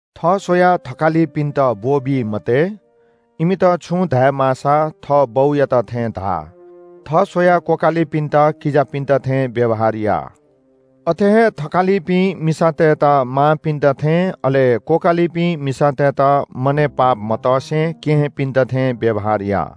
थः स्‍वयाः थकालिपिन्‍त ब्‍वःबी मते। इमित छुं धाये माःसा थः बौयात थें धा। थः स्‍वयाः क्‍वकालिपिन्‍त किजापिन्‍त थें व्‍यवहार या। अथे हे थकालिपिं मिसातय्‌त मांपिन्‍त थें अले क्‍वकालिपिं मिसातय्‌त मनय् पाप मतसे केहेँपिन्‍त थें व्‍यवहार या।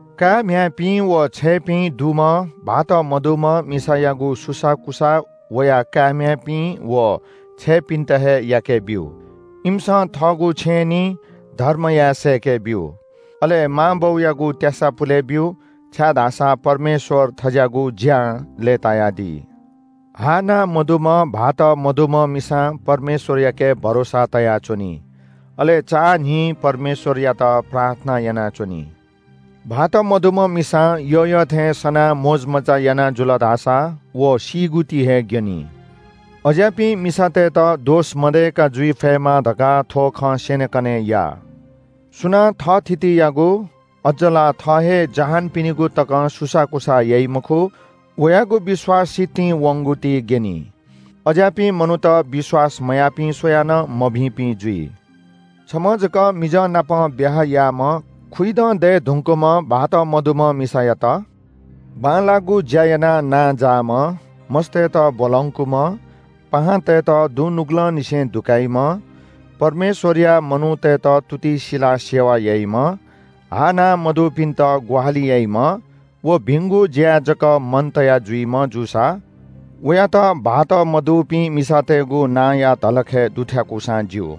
काय्‌म्‍ह्याय्‌पिं व छय्‌पिं दुम्‍ह भाःत मदय्‌ धुंकूपिं मिसातय्‌गु सुसाःकुसाः वया काय्‌म्‍ह्याय्‌पिं व छय्‌पिन्‍त हे याकेब्‍यु। इमिसं थःगु छेँय् निं धर्म याये सय्‌के ब्‍यु, अले मांबौयागु त्‍यासा पुले ब्‍यु, छाय्‌धाःसा परमेश्‍वर थज्‍याःगु ज्‍यां लय्‌तायादी। हाःनाः मदुम्‍ह भाःत मदय्‌ धुंकूपिं मिसां परमेश्‍वरयाके भरोसा तयाच्‍वनी। अले चां न्‍हिं परमेश्‍वरयात प्रार्थना यानाच्‍वनी। भाःत मदय्‌ धुंकूपिं मिसां यःयःथें सनाः मोजमज्‍जा याना जुल धाःसा व सीगु ति हे ग्‍यनी। अज्‍याःपिं मिसातय्‌त दोष मदय्‌क जुइ फयेमा धकाः थ्‍व खँ स्‍यनेकने या। सुनां थःथितियागु, अज्‍ज ला थः हे जहानपिनिगु तकं सुसाःकुसाः याइ मखु, वयागु विश्‍वास सितिं वंगु ति ग्‍यनी। अज्‍याःपिं मनूत विश्‍वास मयाःपिं स्‍वयाः नं मभिंपिं जुइ। छम्‍ह जक मिजंनाप ब्‍याहा याःम्‍ह, खुइदँ दये धुंकूम्‍ह भाःत मदय्‌ धुंकूपिं मिसायात बांलाःगु ज्‍या यानाः नांजाःम्‍ह, मस्‍तय्‌त ब्‍वलंकूम्‍ह, पाहांतय्‌त दुनुगलंनिसें दुकाइम्‍ह, परमेश्‍वरया मनूतय्‌त तुति सिलाः सेवा याइम्‍ह, हाःनाः मदुपिन्‍त ग्‍वाहालि याइम्‍ह व भिंगु ज्‍याय् जक मन तयाः जुइम्‍ह जूसा वयात भाःत मदय्‌ धुंकूपिं मिसातय्‌गु नांया धलखय् दुथ्‍याकूसां ज्‍यू।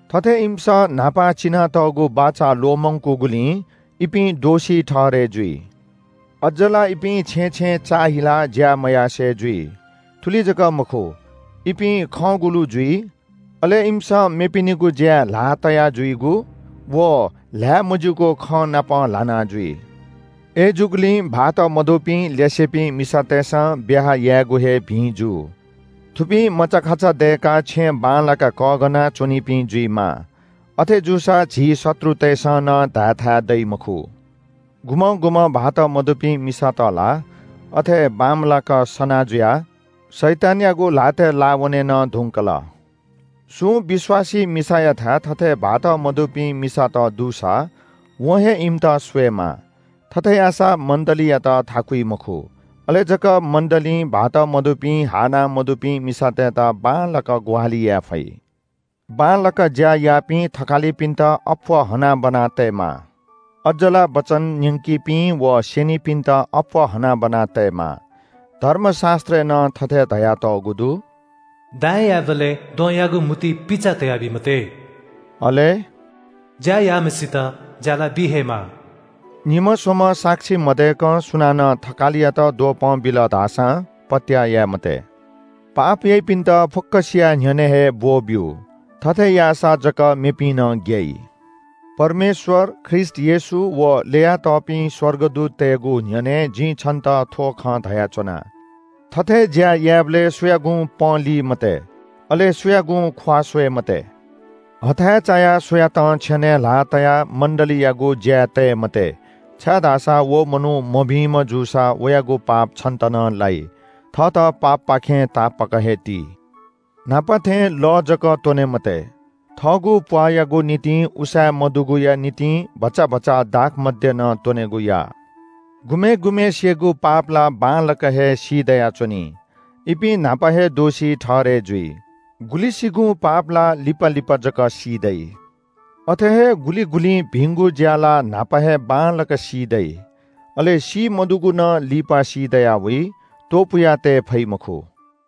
थथे इमिसं न्‍हापा चिनातःगु बाचा ल्‍वःमंकूगुलिं इपिं दोषी ठहरय् जुइ। अज्‍ज ला इपिं छेँय् छेँय् चाःहिलाः ज्‍या मयासें जुइ। थुलि जक मखु, इपिं खँगुलु जुइ, अले इमिसं मेपिनिगु ज्‍याय् ल्‍हाः तया जुइगु व ल्‍हाय् मज्‍यूगु खँनापं ल्‍हाना जुइ। अय्‌जूगुलिं भाःत मदय्‌ धुंकूपिं ल्‍यासेपिं मिसातय्‌सं ब्‍याहा यायेगु हे भिं जू। थुपिं मचाखाचा दय्‌काः छेँ बांलाक कःघाना च्‍वनीपिं जुइमाः। अथे जूसा झी शत्रुतय्‌सं नं धायेथाय् दइ मखु। गुम्‍हं गुम्‍हं भाःत मदय्‌ धुंकूपिं मिसात ला अथे बांमलाक सना जुयाः शैतानयागु ल्‍हातय् लाः वने नं धुंकल। सुं विश्‍वासी मिसायाथाय् थथे भाःत मदय्‌ धुंकूपिं मिसात दुसा वं हे इमित स्‍वयेमाः। थथे याःसा मण्‍डलीयात थाकुइ मखु। अले जक मण्‍डलीं भाःत मदय्‌ धुंकूपिं हाःनाः मदुपिं मिसातय्‌त बांलाक ग्‍वाहालि याये फइ। बांलाक ज्‍या याःपिं थकालिपिन्‍त अप्‍वः हनाबना तयेमाः। अज्‍ज ला वचन न्‍यंकीपिं व स्‍यनिपिन्‍त अप्‍वः हनाबना तयेमाः। धर्मशास्‍त्रय् नं थथे धयातःगु दु – “दाइं यायेबलय् द्वहंयागु म्‍हुतुइ पिचा तयाबी मते।” अले “ज्‍या याःम्‍हय्‌सित ज्‍यालाबी हे माः।” निम्‍ह स्‍वम्‍ह साक्षी मदय्‌कं सुनानं थकालियात द्वपं बिल धाःसां पत्‍याः याये मते। पाप याइपिन्‍त फुक्‍कसिया न्‍ह्यःने हे ब्‍वःब्‍यु। थथे याःसा जक मेपिं नं ग्‍याइ। परमेश्‍वर, ख्रीष्‍ट येशू व ल्‍ययातःपिं स्‍वर्गदूततय्‌गु न्‍ह्यःने जिं छन्‍त थ्‍व खँ धयाच्‍वना। थथे ज्‍या यायेबलय् सुयागुं पँली मते, अले सुयागुं ख्‍वाः स्‍वये मते। हथाय् चायाः सुयातं छेनय् ल्‍हाः तयाः मण्‍डलीयागु ज्‍याय् तये मते, छाय्‌धाःसा व मनू मभिंम्‍ह जूसा वयागु पाप छन्‍त नं लाइ। थःत पापपाखें तापाक हे ति। न्‍हापा थें लः जक त्‍वने मते। थःगु प्‍वाःयागु निंतिं उसाँय् मदुगुया निंतिं भचा भचा दाखमद्य नं त्‍वनेगु या। गुम्‍हय् गुम्‍हय्‌सिगु पाप ला बांलाक हे सी दयाच्‍वनी, इपिं न्‍हापा हे दोषी ठहरय् जुइ। गुलिसिगुं पाप ला लिपा लिपा जक सी दइ। अथे हे गुलि गुलिं भिंगु ज्‍या ला न्‍हापा हे बांलाक सी दइ। अले सी मदुगु नं लिपा सीदयावइ, त्‍वपुयातये फइ मखु।